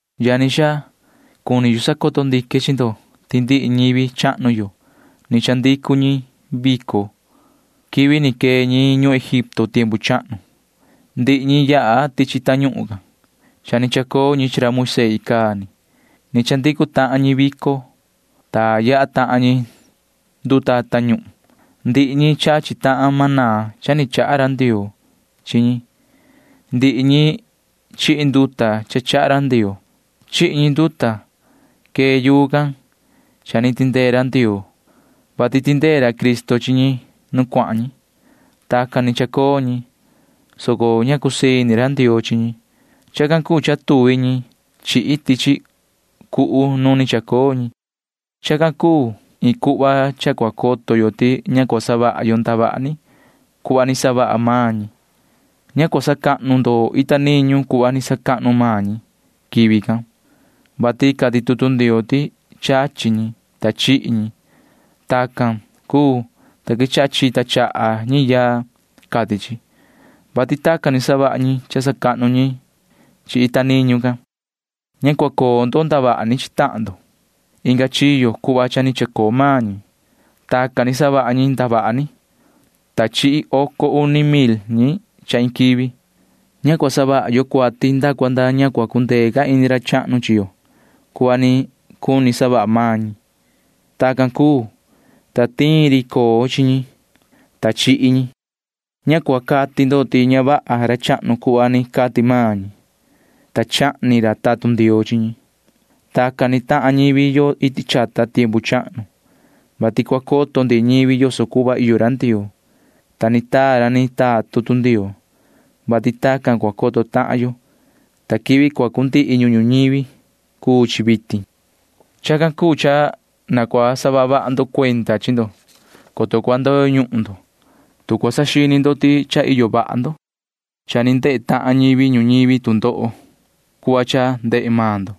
Yani xaa, cuni yu sacoto ndique chi ndo ti ndihi ñivi chahnu yo―ni chandicu ñi vico [quivi ni quee ñi ñuhun Egipto tiempu chahnu]. Ndihi ñi yaha tichi tañuhun can. Cha ni chacoo ñi chi ra Moisee icaa ni. Ni chandicu tahan ñi vico, ta yaha tahan ñi nduta tañuhun. Ndihi ñi chachi tahan maná cha ni chaha ra Ndioo chi ñi. Ndihi ñi chihi nduta cha chaha ra Ndioo. Chihi ñi nduta quee yuu can cha ni tindee Ndioo, vati tindee ra Cristo chi ñi nu cuahan ñi. Tacan ni chacoo ñi, soco ña cusii ini ra Ndioo chi ñi. Chacan cuu cha tuvi ñi chihi tichi cuhu nu ni chacoo ñi. Chacan cuu iin cuhva cha cua coto yo ti ña cua savaha yo ndavaha ni cuhva ni savaha maan ñi. Ña cua sacahnu ndo ita niñu cuhva ni sacahnu maan ñi quivi can, vati cati tutu Ndioo ti chachi ñi, ta chihi ñi. Tacan cuu, ta quechaha chita chaha ñi yaa, cati chi, [vati tacan ni savaha ñi cha sacahnu ñi chi ita niñu can]. Ña cua coo ndo ndavaha ni chi tahan ndo inga chiyo cuhva cha ni chacoo maan ñi. Tacan ni savaha ñi ndavaha ni, ta chihi oco uni mil ñi cha iin quivi. Ña cua savaha yo cuati nda cua nda ña cua cundee ca ini ra chahnu chi yo cuhva ni cuni savaha maan ñi. Tacan cuu, ta tiin ri coo chi ñi, ta chihi ñi. Ña cua cati ndo ti ña vaha ra chahnu cuhva ni cati maan ñi, ta chahni ra tatun Ndioo chi ñi. Tacan ni tahan ñivi yo iti chata tiempu chahnu, vati cua coto ndihi ñivi yoso cuhva iyo ra Ndioo, ta ni taa ra ni taa tutu Ndioo, vati tacan cua coto tahan yo, ta quivi cua cundihi ñuhun ñuñivi cuu chi vitin. Chacan cuu cha na cua saha vaha ndo cuenda chi ndo, coto cua ndoyo ñuhun ndo, tu cua saxini ndo ti cha iyo vaha ndo. Cha ni ndehe tahan ñivi ñuñivi tu ndoho cuhva cha ndehe maan ndo.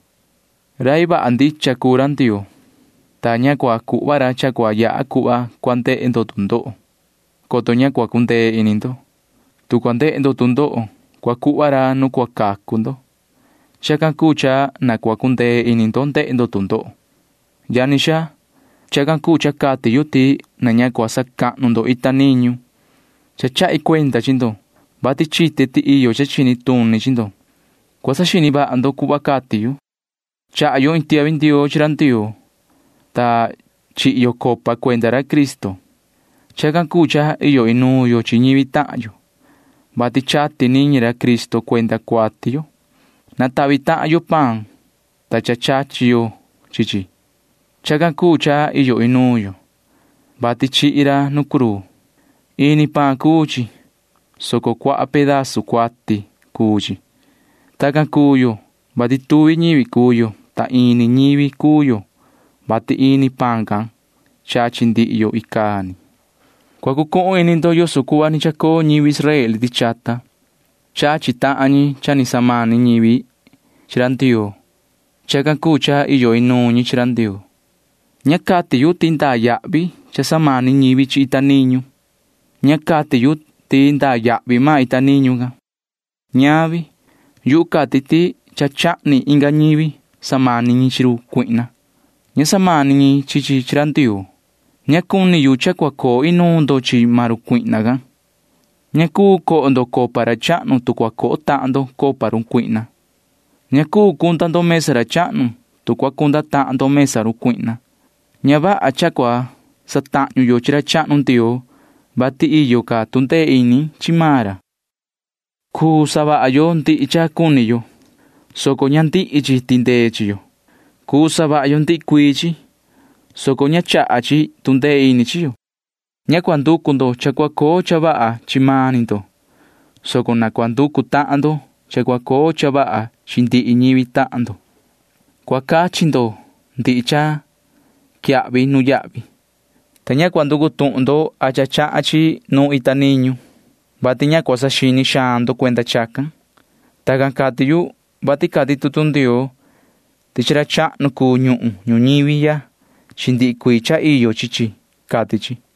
Rai vaha ndicha cuu ra Ndioo, ta ña cua cuhva ra cha cua yaha cuhva cua ndehe ndo tu ndoho, coto ña cua cundee ini ndo. Tu cua ndehe ndo tu ndoho, cua cuhva ra nu cua cacu ndo. Chacan cuu cha na cua cundee ini ndo ndehe ndo tu ndoho. Yani xaa, chacan cuu cha cati yu ti na ña cua sacahnu ndo ita niñu. Cha chahi cuenda chi ndo, vati chite ti iyo cha chini tuni chi ndo. Cua saxini vaha ndo cuhva cati yu. Chaha yo iin tiahvi ndioo chi ra Ndioo, ta chihi yo copa cuenda ra Cristo. Chacan cuu cha iyo inuun yo chi ñivi tahan yo, vati chati niñi ra Cristo cuenda cuati yo. Natahvi tahan yo paan, [ta cha chachi yo chi chi]. Chacan cuu cha iyo inuun yo, vati chihi ra nu cruu. Ini paan cuu chi, soco cuaha pedazu cuati cuu chi. Tacan cuu yo, vati tuvi ñivi cuu yo, soco ini ñivi cuu yo, vati ini paan can chachi ndihi yo icaa ni. Cua cucuhun ini ndo yoso cuhva ni chacoo ñivi Israel iti chata. Chachi tahan ñi cha ni samani ñivi chi ra Ndioo. Chacan cuu cha iyo inuun ñi chi ra Ndioo. Ña cuni cati yu ti ndaa yahvi cha samani ñivi chi ita niñu. Ña cati yu ti ndaa yahvi maan ita niñu can. Ñavi. Yuhu cati ti cha chahni inga ñivi samani ñi chi run cuihna. Ña samani ñi chi chi chi ra Ndioo. Ña cuni yu cha cua coo inuun ndo chi maan run cuihna can. Ña cuu coho ndo copa ra chahnu, tu cua coho tahan ndo copa run cuihna. Ña cuu cunda ndo mesa ra chahnu, tu cua cunda tahan ndo mesa run cuihna. Ña vaha cha cua satahñu yo chi ra chahnu Ndioo, vati iyo ca tu ndee ini chi maan ra. Cuu savaha yo ndihi cha cuni yo, soco ña ndihi chi tindee chi yo. Cuu savaha yo ndihi cuii chi, soco ña chaha chi tu ndee ini chi yo. Ña cua nducu ndo cha cua coo cha vaha chi mani ndo, soco na cua nducu tahan ndo cha cua coo cha vaha chi ndihi ñivi tahan ndo. Cua cachi ndo ndihi cha quiyahvi nuyahvi, ta ña cua nducu tuhun ndo a cha chahan chi nu iyo ita niñu, vati ña cua saxini xaan ndo cuenda chacan. Tacan cati yu, vati cati tutu Ndioo ti chi ra chahnu cuu ñuhun ñuñivi ya chi ndihi cuii cha iyo chi chi, cati chi.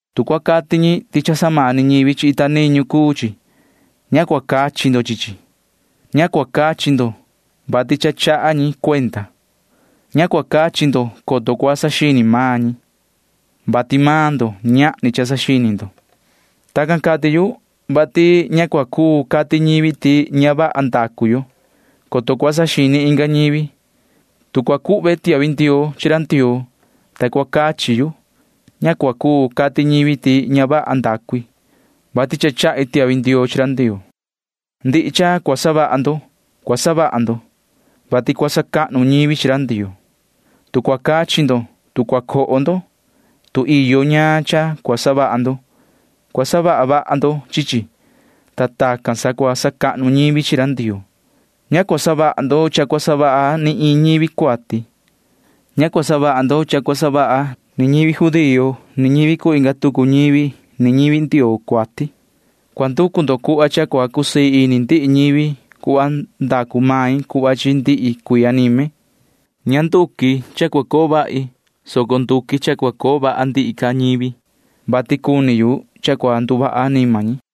Tu cua cati ñi ti cha samani ñivi chi ita niñu cuu chi, ña cua cachi ndo chi chi. Ña cua cachi ndo, vati cha chaha ñi cuenda. Ña cua cachi ndo, coto cua saxini maan ñi, vati maan ndo―ñahni cha saxini ndo. Tacan cati yu, vati ña cua cuu cati ñivi ti ña vaha ndacu yo, coto cua saxini inga ñivi. Tu cua cuhve tiahvi ndioo chi ra Ndioo, ta cua cachi yu, ña cua cuu cati ñivi ti ña vaha ndacu i, vati cha chahi tiahvi ndioo chi ra Ndioo. Ndihi cha cua savaha ndo cua savaha ndo, vati cua sacahnu ñivi chi ra Ndioo. Tu cua cachi ndo, tu cua coho ndo, tu iyo ñaan cha cua savaha ndo, cua savaha vaha ndo chi chi, ta tacan sa cua sacahnu ñivi chi ra Ndioo. Ña cua savaha ndo cha cua savaha ni iin ñivi cuati. Ña cua savaha ndo cha cua savaha ni ñivi judío ni ñivi cuu inga tucu ñivi ni ñivi Ndioo cuati. Cua nducu ndo cuhva cha cua cusii ini ndihi ñivi cuhva nducu main cuhva chi ndihi cuii anime. Ña nduqui cha cua coo vahi, soco nduqui cha cua coo vaha ndihi ca ñivi, vati cuni yu cha cua nduvaha anima ñi.